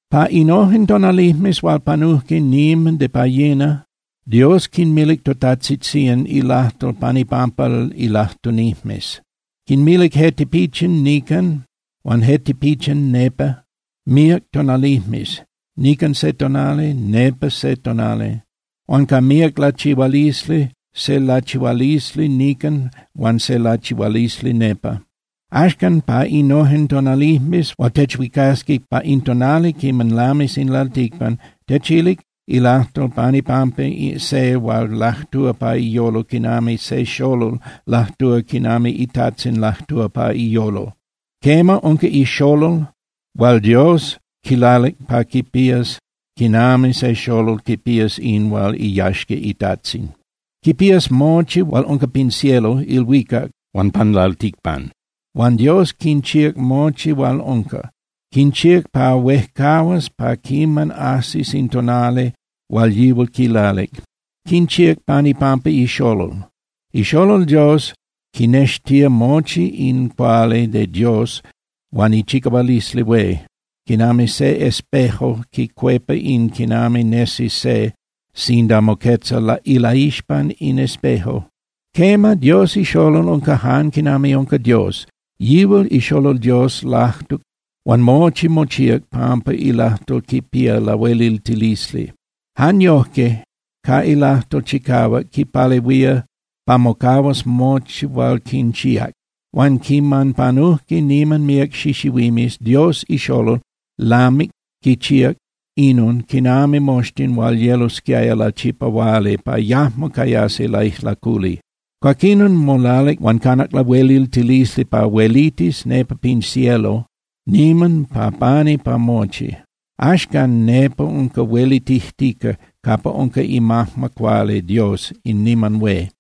Pa innojen tonalijmes hual panujque niman de pa yina, Dios quinmilic totajtzitzían ilajtol pan ipampa ilajtunijmes. Quinmilic je tipichin nican huan je tipichin nepa míac tonalijmes, nican se tonali, nepa se tonali, huan ca míac lachihualisli, se lachihualisli nican huan se lachihualisli nepa. Axcan, pa innojen tonalijmes hual techhuicasqui pa in tonali quiman lamis in lalticpan, techilic ilajtol pan ipampa se hual lajtúa pa iyolo quinami se xolol lajtúa quinami itajtzin lajtúa pa iyolo. Quema, unca iXolol hual Dios quilalic pa quipías quinami se xolol quipías in hual iyaxca itajtzin. Quipías mochi hual unca pin cielo (ilhuicac) huan pan lalticpan. Huan Dios quinchíac mochi hual unca, quinchíac pa huejcahuas pa quiman ajsis in tonali hual yihual quilalic. Quinchíac pan ipampa iXolol. IXolol Dios quinextía mochi in cuali de Dios huan ichicahualisli hué, quinami se espejo quicuepa in quinami nesi se sinda moquetza ilaixpan in espejo. Quema, Dios iXolol unca jan quinami unca Dios. Yihual iXolol Dios lajtuc huan mochi mochíac pampa ilajtol quipía lahueliltilisli. Jan yojque ca ilajtol chicahuac quipalehuía pa mocahuas mochi hual quinchíac. Huan quiman panujque niman míac xixihuimes, Dios iXolol lamic quichíac inon quinami moxtin huil yelosquiaya lachipahuali pa yajmo cayasi laijlaculi. Cuaquinon molalic huan canac lahueliltilisli pa huelitis nepa pin cielo niman pa pani pa mochi. Axcan nepa unca huelitijtica capa unca imajma cuali Dios in niman hué.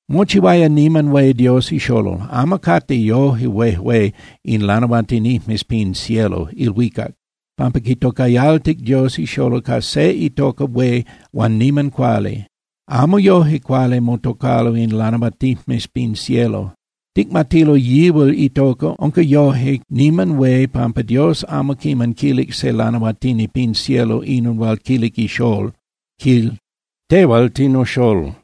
Mochihuaya niman hué Dios iXolol. Amo cate yoje huejué in lanahuatinijmes pin cielo (ilhuicac) pampa quitocayaltijque Dios iXolol ca se itoca hué huan niman cuali. Amo yoje cuali motocalo in lanahuatinijmes pin cielo. Ticmatilo yihual itoca unca yoje niman hué pampa Dios amo quiman quilic se lanahuatini pin cielo inon hual quilic iXolol, quil: Tehual tinoXolol,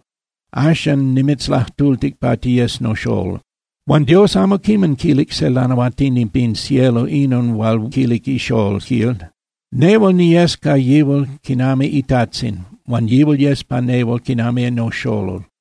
axan nimitzlajtultic pa tiyes noXolol. Huan Dios amo quiman quilic se lanahuatini pin cielo inon hual quilic iXolol, quil: Nehual niyes ca yihual quinami iTajtzin, huan yihual yes pa nehual quinami noXolol.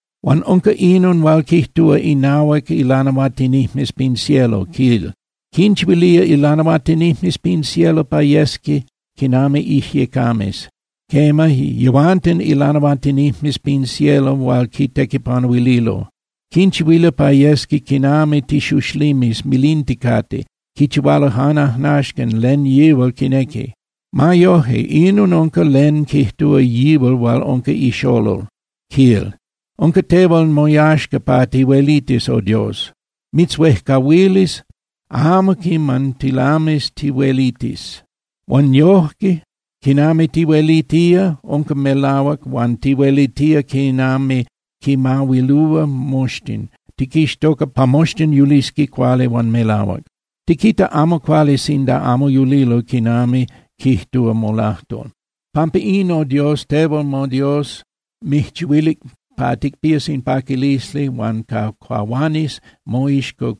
Huan unca inon hual quijtúa innahuac ilanahuatinijmes pin cielo, quil: Quinchihuilía ilanahuatinijmes pin cielo pa yesqui quinami ijyecames. Quema, yehuanten ilanahuatinijmes pin cielo hual quitequipanuililo, quinchihuilía pa yesqui quinami tixuxlimes milinticate. Quichihualo jan ajnaxcan len yihual quinequi. Ma yoje, inon unca len quijtúa yihual hual unca iXolol, quil: Unca tehual moyaxca pa tihuelitis, O Dios, mitzhuejcahuilis, amo quiman tilamis tihuelitis. Huan yojque quinami tihuelitía unca melahuac huan tihuelitía quinami quinmahuilúa moxtin, tiquixtoca pa moxtin yulisqui cuali huan melahuac. Tiquita amo cuali sinda amo yulilo quinami quijtúa molajtol. Pampa in, O Dios, tehual moDios mijchihuilic pa ticpías in paquilisli huan pa cahuanis moixco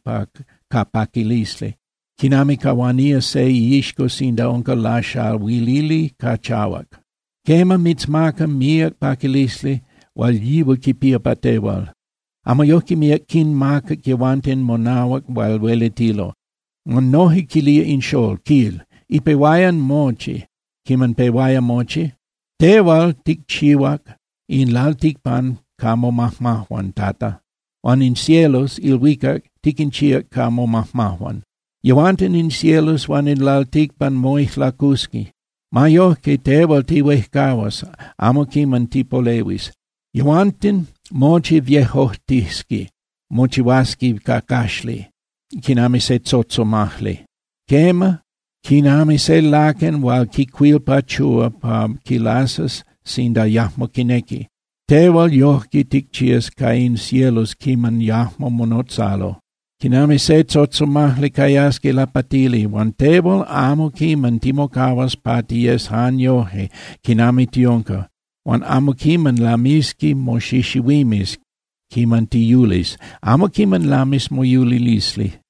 ca paquilisli, quinami cahuanía se iixco sinda unca laxahuilili ca chahuac. Quema, mitzmaca míac paquilisli hual yihual quipía pa tehual. Amo yojque míac quinmacac yehuanten monahuac hual huelitilo. Huan noje quilía in Xolol, quil: Ipehuayan mochi (Quiman pehuaya mochi), tehual ticchihuac in lalticpan ca momajmajuan, Tata, huan in cielos (ilhuicac) tiquinchíac ca momajmajuan. Yehuanten in cielos huan in lalticpan moijlacusqui. Ma yoje, tehual tihuejcahuas, amo quiman tipolehuis. Yehuanten mochi viejojtisqui (mochihuasqui cacaxli) quinami se tzotzomajli. Quema, quinami se laquen hual quicuilpachúa pa quilasas sinda yajmo quinequi, tehual yojque ticchías ca in cielos quiman yajmo monotzalo. Quinami se tzotzomajli, cayasqui lapatili. Huan tehual, amo quiman timocahuas pa tiyes jan yoje quinami tiunca, huan amo quiman lamisqui moxixihuimes quiman tiyulis, amo quiman lamis moyulilisli.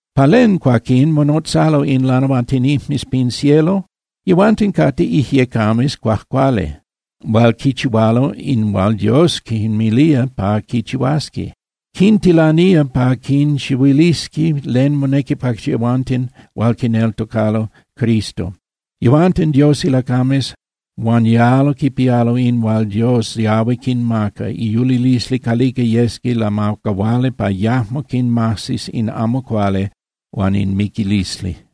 ¿Pa len, cuaquín, monotzalo in lanahuatinijmes pin cielo? Yehuanten cate ijyecames cuajcuali hual quichihualo in hual Dios quinmilía pa quichihuasqui. Quintilanía pa quinchihuilisqui len monequi pa yehuanten hual quineltocalo Cristo. Yehuanten Dios ilacames, huan yalo quipialo in hual Dios yahui quinmaca, iyulilisli calica yesqui lamacahuali pa yajmo quinmajsis in amo cuali huan in miquilisli.